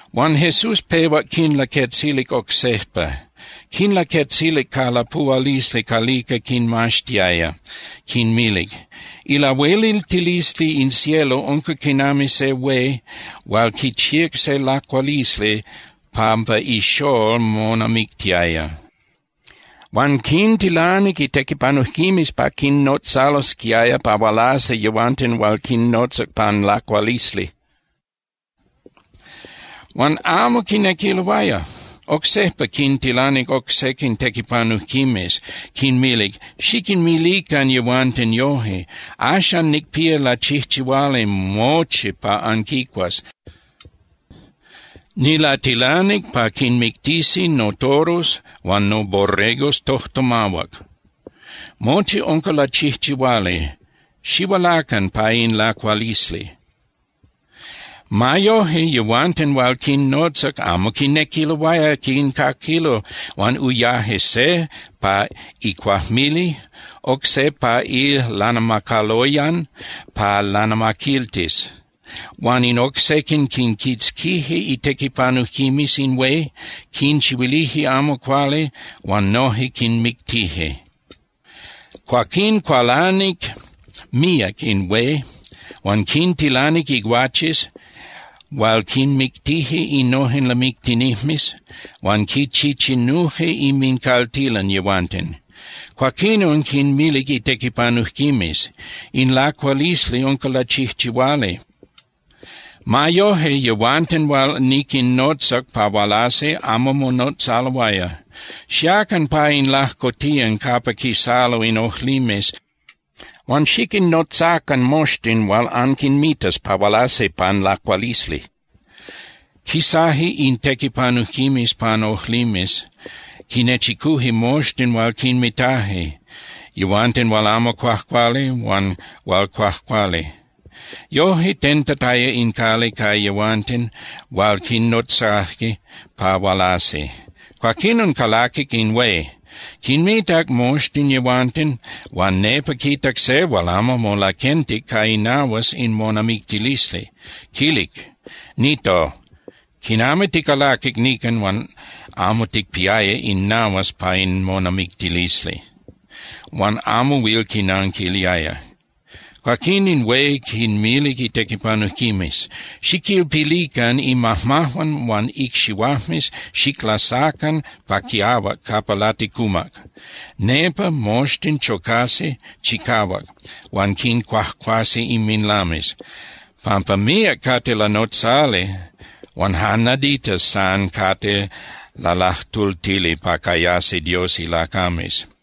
Huan Jesús pehuac quinlaquetzilic oc sejpa, quinlaquetzilic ca lapuhualisli calica quinmaxtiaya, quinmilic: —Ilahueliltilisli in cielo unca quinami se hué hual quichíac se lacualisli pampa ixól monamictiaya. Huan quintilanic itequipanujquimes pa quinnotzalosquiaya pa hualasi yehuanten hual quinnotzac pan lacualisli. Huan amo quinequiloaya. Oc sejpa quintilanic oc sequin tequipanujquimes, quinmilic: “Xiquinmilican yehuanten yoje: Axan nicpía lachijchihuali mochi pa anquicuas. Nilatilanic pa quinmictisi notoros huan noborregos tojtomahuac. Mochi unca lachijchihuali. Xihualacan pa in lacualisli.” Ma yoje, yehuanten hual quinnotzac amo quinequiloaya quincaquilo huan uyaje se pa icuajmili, oc se pa ilanamacaloyan pa lanamaquiltis. Huan in oc sequin quinquitzquije itequipanujquimes in hué, quinchihuilije amo cuali huan noje quinmictije. Cuaquín cualanic míac in hué huan quintilanic iguaches hual quinmictije innojen lamictinijmes huan quichichinuje inmincaltilan yehuanten. Cuaquinon quinmilic itequipanujquimes: “In lacualisli unca lachijchihuali. Ma yoje, yehuanten hual niquinnotzac pa hualasi amo monotzaloaya. Xiacan pa in lajcotiyan capa quisalo in ojlimes huan xiquinnotzacan moxtin hual anquinmitas pa hualasi pan lacualisli.” Quisaje in tequipanujquimes pan ojlimes, quinechicuje moxtin hual quinmitaje, yehuanten hual amo cuajcuali huan hual cuajcuali. Yoje tentataya in cali ca yehuanten hual quinnotzaje pa hualasi. ’Cuaquinon calaquic in hué, quinmitac moxtin yehuanten huan nepa quitac se hual amo molaquentic ca inahuas in monamictilisli. Quilic: “Nito, ¿quinami ticalaquic nican huan amo ticpiaya in nahuas pa in monamictilisli?” Huan amo huil quinanquiliaya. Cuaquín in hué quinmilic itequipanujquimes: “Xiquilpilican imajmajuan huan icxihuajmes, xiclasacan pa quiahuac capa laticumac. Nepa moxtin chocasi chicahuac huan quincuajcuasi inminlames.” Pampa míac cate lanotzali huan jan naditas san cate lalajtultili pa cayasi Dios ilacames.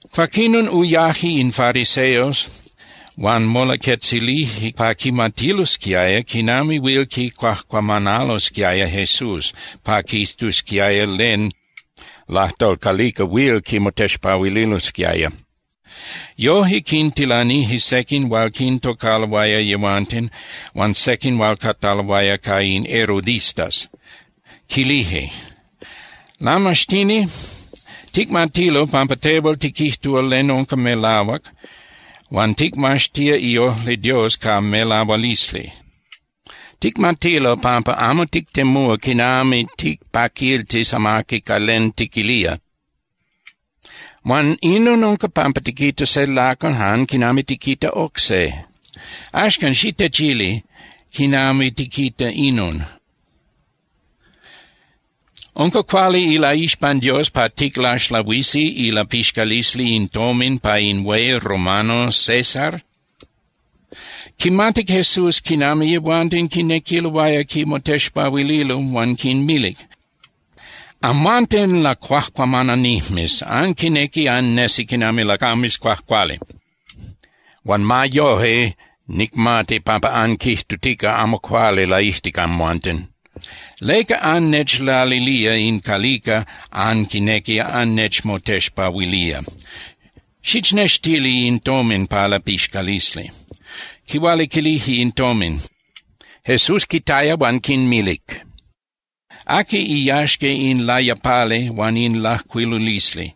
Cuaquinon uyaje in fariseos huan molaquetzilije pa quimatilosquiaya quinami huil quicuajcuamanalosquiaya Jesús pa quijtusquiaya len lajtol calica huil quimotexpahuililosquiaya. Yoje quintilanije sequin hual quintocaloaya yehuanten huan sequin hual cataloaya ca in herodistas, quilije: —Lamaxtini, ticmatilo pampa tehual tiquijtúa len unca melahuac huan ticmaxtía iojli Dios ca melahualisli. Ticmatilo pampa amo tictemúa quinami ticpaquiltis amaqui ca len tiquilía, huan inon unca pampa tiquita se lacal jan quinami tiquita oc se. Axcan, xitechili quinami tiquita inon. ¿Unca cuali ilaixpan Dios pa ticlaxlahuisi ilapixcalisli in tomin pa in hué romano César? Quimatic Jesús quinami yehuanten quinequiloaya quimotexpahuililo huan quinmilic: —Amhuanten lacuajcuamananijmes, anquinequi annesi quinami lacames cuajcuali, huan ma yoje nicmati pampa anquijtutica amo cuali laijtic amhuanten. ¿Leca annechlalilía in calica anquinequi annechmotexpahuilía? Xichnextili in tomin pa lapixcalisli. Quihualiquilije in tomin. Jesús quitaya huan quinmilic: —¿Aqui iyaxca in layapali huan in lajcuilulisli?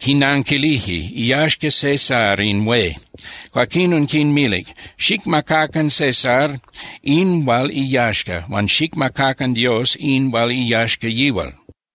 Quinanquilije: —Iyaxca César in hué. Cuaquinon quinmilic: —Xicmacacan César in hual iyaxca, huan xicmacacan Dios in hual iyaxca yihual.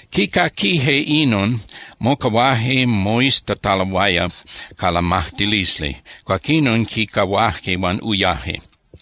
Quicaquije inon, mocahuaje moiztataloaya ca lamajtilisli. Cuaquinon quicahuaje huan uyaje.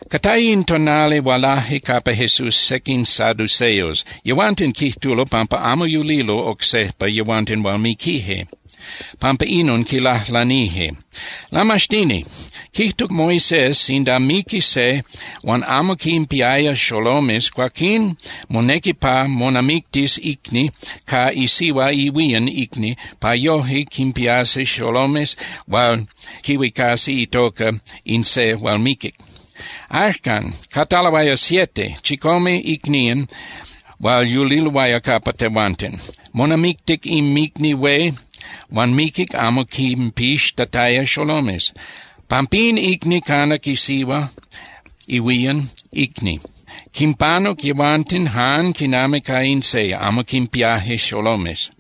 Cataya in tonali hualaje capa Jesús sequin saduceos. yehuanten quijtulo pampa amo yulilo oc sejpa yehuanten hual miquije. Pampa inon, quilajlanije: —Lamaxtini, quijtuc Moisés sinda miqui se huan amo quinpiaya xolomes, cuaquín monequi pa monamictis icni ca isihua ihuían icni pa yoje quinpiasi xolomes hual quihuicasi itoca in se hual miquic. Axcan, cataloaya siete (chicome) icnían hual yuliloaya capa tehuanten. Monamictic inmicni hué huan miquic amo quinpixtataya xolomes. Pampín icni canac isihua ihuían icni. Quimpanuc yehuanten jan quinami ca in se, amo quinpiaje xolomes.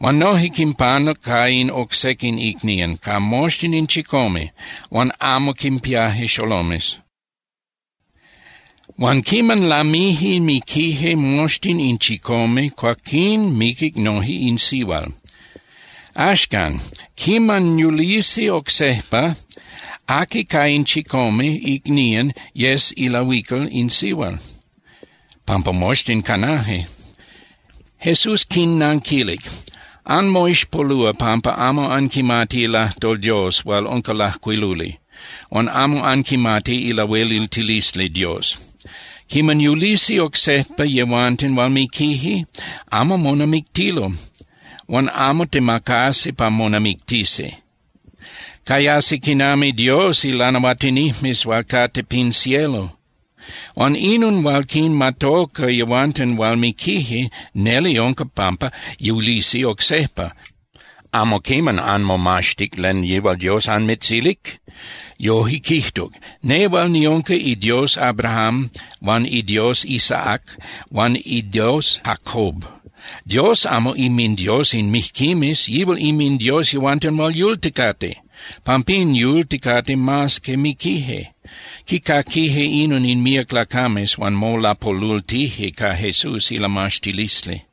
Huan noje quinpanuc ca in oc sequin icnían, ca moxtin in chicome, huan amo quinpiaje xolomes. Huan quiman lamije miquije moxtin in chicome, cuaquín miquic noje in sihual. Axcan, quiman yulisi oc sejpa, ¿aqui ca in chicome icnían yes ilahuical in sihual? Pampa moxtin canaje. Jesús quinnanquilic: —Anmoixpolúa pampa amo anquimati ilajtol Dios hual unca lajcuiluli, huan amo anquimati ilahueliltilisli Dios. Quiman yulisi oc sejpa yehuanten hual miquije, amo monamictilo huan amo temacasi pa monamictisi. Cayasi quinami Dios ilanahuatinijmes hual cate pin cielo. Huan inon hual quinmatoca yehuanten hual miquije, neli unca pampa yulisi oc sejpa. ¿Amo quiman anmomaxtic len yihual Dios anmitzilic? Yoje quijtuc: “Nehual niunca iDios Abrahám huan iDios Isaac huan iDios Jacob.” Dios amo inminDios in mijquimes. Yihual inminDios yehuanten hual yulticate. Pampín yulticate mas que miquije. Quicaquije inon in míac lacames, huan molapolultije ca Jesús ilamaxtilisli.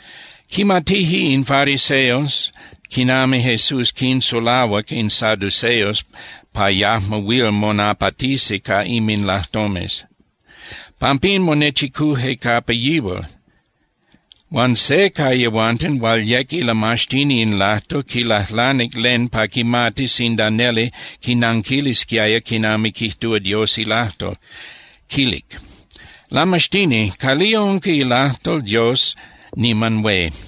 Quimatije in fariseos quinami Jesús quinsulahuac in saduceos pa yajmo huil monapatisi ca inminlajtomes. Pampín monechicuje capa yihual. Huan se ca yehuanten hual yec ilamaxtini in lajtol quilajlanic len pa quimatis sinda neli quinanquilisquiaya quinami quijtúa Dios ilajtol, quilic: —Lamaxtini, ¿calía unca ilajtol Dios niman hué?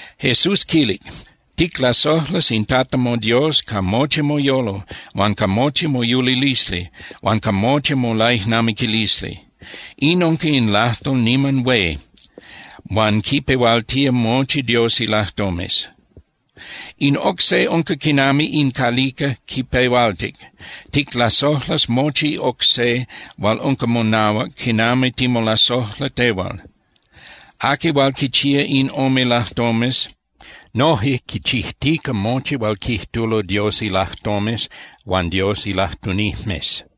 Jesús quilic: —“Ticlasojlas in Tata moDios ca mochi moyolo huan ca mochi moyulilisli huan ca mochi molaijnamiquilisli.” In unca in lajtol niman hué huan quipehualtía mochi Dios ilajtomes. In oc se unca quinami in calica quipehualtic: “Ticlasojlas mochi oc se hual unca monahuac quinami timolasojla tehual.” Aqui hual quichía in ome lajtomes, noje quichijtica mochi hual quijtulo Dios ilajtomes huan Dios ilajtunijmes.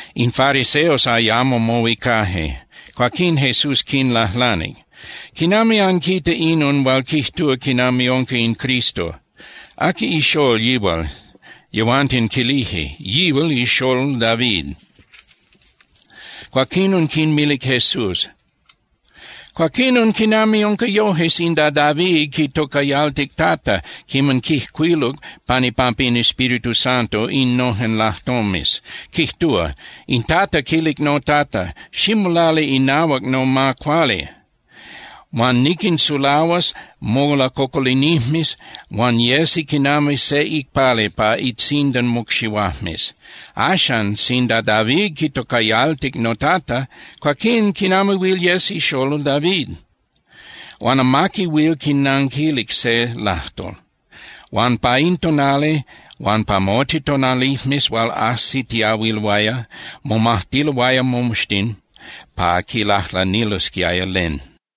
In fariseos ayamo mohuicaje. Cuaquín Jesús quinlajlanic: —¿Quinami anquita inon hual quijtúa quinami unca in Cristo? ¿Aqui ixól yihual? Yehuanten quilije: —Yihual ixól David. Cuaquinon quinmilic Jesús: —Cuaquinon, ¿quinami unca yoje sinda David quitocayaltic Tata quiman quijcuiluc pan ipampa in Espíritu Santo innojen lajtomes? Quijtúa: In Tata quilic noTata: “Ximolali inahuac noma cuali, huan niquinsulahuas molacocolinijmes huan yesi quinami se icpali pa itzindan mocxihuajmes.” Axan, sinda David quitocayaltic “noTata”, cuaquín ¿quinami huil yes ixolol David? Huan amaqui huil quinanquilic se lajtol. Huan pa in tonali huan pa mochi tonalijmes hual ajsitiahuiloaya, momajtiloaya moxtin pa quilajlanilosquiaya len.